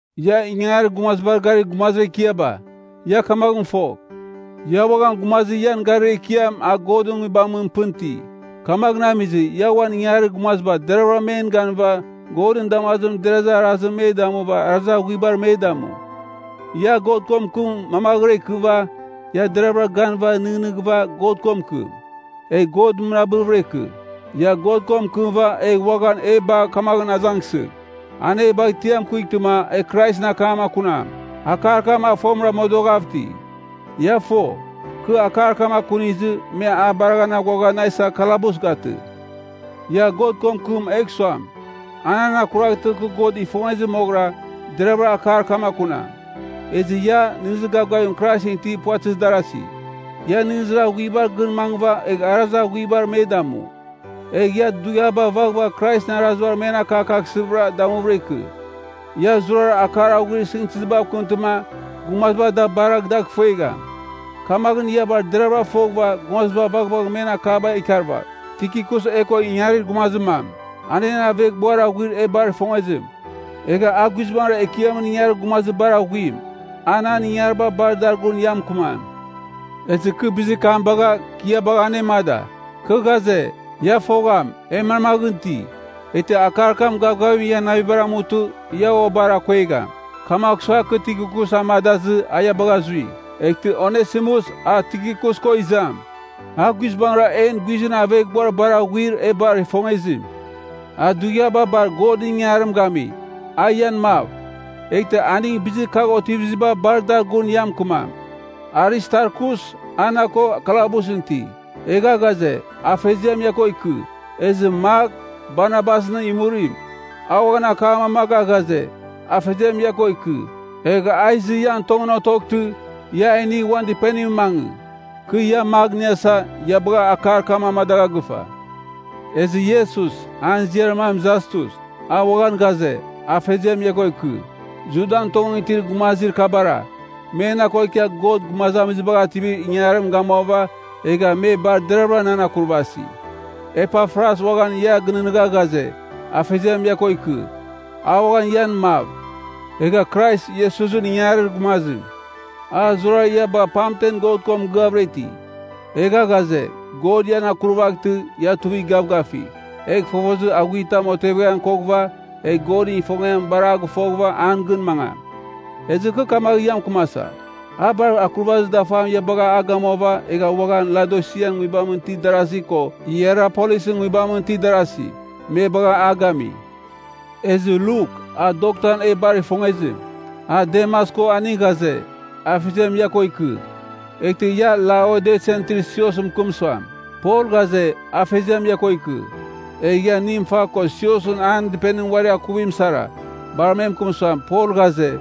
Ia ingangarir gumazibar garir gumazir ekiaba, ia kamaghɨn fogh, ia uaghan gumazir ian garir ekiam a Godɨn Nguibamɨn pɨn iti. Kamaghɨn amizɨ, ia uan ingangarir gumaziba deravɨra men ganɨva Godɨn damazimɨn derazir arazimɨn me damuva arazir aghuibar me damu. Ia God ko mɨkɨm mamaghɨra ikɨva, ia deraghvɨra ganɨva nɨghnɨghɨva God ko mɨkɨm, egh God mɨnabɨvɨra ikɨ. Ia God ko mɨkɨmɨva egh uaghan e bagh kamaghɨn azangsɨgh, an e bagh tiam kuightɨma e Kraisɨn akam akunam. Akar kam a fomɨra modoghav iti. Ia fo, kɨ akar kam akunizɨ, me a baraghan aghuagha na isa kalabus gatɨ. Ia God ko mɨkɨm egh suam, a nan akuraghtɨ kɨ God ifongezir moghɨra, deraghvɨra akar kam akunam. Ezɨ ia, nɨghnɨzir gavgavim Kraisɨn itir puvatɨzir darasi, ia nɨghnɨzir aghuibar gɨn mangɨva egh arazir aghuibar me damu. Egh ia dughiaba vaghvagh Kraisɨn arazibar men akakaghsɨvɨra damuvɨra ikɨ. Ia zurara akar aghuir sɨngtɨzibav kɨmtɨma, gumaziba da baragh dagh ifuegham. Kamaghɨn ia bar deravɨra foghɨva gumaziba vaghvagh men akaba ikarvagh. Tikikus e ko ingangarir gumazir mam, a en aveghbuar aghuir e bar ifongezim, egha a guizbangɨra Ekiamɨn ingangarir gumazir bar aghuim. A nan ingangariba bar dar gun ia mɨkɨmam. Ezɨ bizir kam bagha, kɨ ia bagha anemada. Kɨ ghaze, ia fogham, e manmaghɨn iti, eghtɨ akar kam gavgavim ian navibar amutɨ ia ua bar akuegham. Kamagh sua, kɨ Tikikus amadazɨ, a ia bagha zui. Eghtɨ Onesimus, a Tikikus ko izam, a guizbangɨra en guizɨn aveghbuar bar aghuir e bar ifongezim, a dughiaba bar Godɨn ingangarim gami. A ian mav. Eghtɨ aning bizir kagh otiviziba bar dar gun ia mɨkɨmam. Aristarkus, a na ko kalabusɨn iti, egha ghaze, Afeziam ia ko ikɨ. Ezɨ Mak, Barnabasɨn imurim, a uaghan akam amaga ghaze, Afeziam ia ko ikɨ. (Egh a izɨ ian tongɨn otoghtɨ ia a inigh uan dɨpenimɨn mangɨ. Kɨ ia Mak iniasa, ia bagha akar kam amadagha gɨfa.) Ezɨ Iesus, an ziar mam Jastus, a uaghan ghaze, Afeziam ia ko ikɨ. Judan tongɨn itir gumazir kabara, me na ko ikia God Gumazamizibagh Ativir Ingangarim gamuava egha me bar deraghavɨra nan akurvasi. Epafras uaghan ia gɨnɨghnɨgha ghaze, Afeziam ia ko ikɨ. A uaghan ian mav, egha Krais Iesusɨn ingangarir gumazim. A zurara ia bagha pamten God ko mɨgɨavɨra iti, egha ghaze, God ian akurvaghtɨ, ia tuivigh gavgavigh, egh fofozir aghuitam oteveghan koghɨva, egh Godɨn ifongiam bar a gɨfoghɨva an gɨn mangam. Ezɨ kɨ kamaghɨn ia mɨkɨmasa, a bar akurvazir dafam ia bagha a gamuava egha uaghan Laodisian nguibamɨn itir darasi ko Hierapolisɨn nguibamɨn itir darasi, me bagha a gami. Ezɨ Luk, a doktan e bar ifongezim, a Demas ko aning ghaze, Afeziam ia ko ikɨ. Eghtɨ ia Laodisian itir siosɨn mɨkɨm suam, Pol ghaze, Afeziam ia ko ikɨ. Egh ia Nimfa ko siosɨn an dɨpenimɨn uari akuvim sara, bar me mɨkɨm suam, Pol ghaze,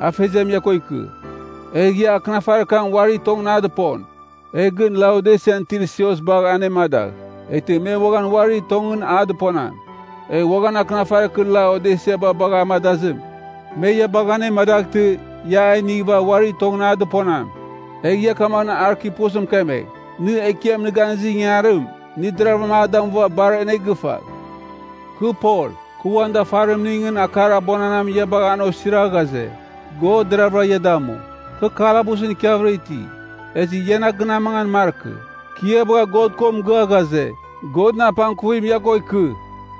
Afeziam ia ko ikɨ. Egh ia akɨnafarir kam uari tongɨn a dɨpon, egh gɨn Laodisian itir sios bagh anemadagh, eghtɨ me uaghan uarir tongɨn a dɨponam. Egh uaghan akɨnafarir kɨ Laodisiaba bagha amadazim, me ia bagh anemadaghtɨ, ia a inighɨva uarir tongɨn a dɨponam. Egh ia kamaghɨn Arkipusɨn mɨkemegh, “Nɨ, Ekiam nɨ ganɨngizir ingangarim, nɨ deravɨra a damuva bar anegɨfagh.” Kɨ Pol, kɨ uan dafarimningɨn akar abuananam ia bagha an osira ghaze: God deravɨra ia damu. Kɨ kalabusɨn ikiavɨra iti, ezɨ ia na gɨn amangan markɨ. Kɨ ia bagha God ko mɨgɨa ghaze, Godɨn apangkuvim ia ko ikɨ.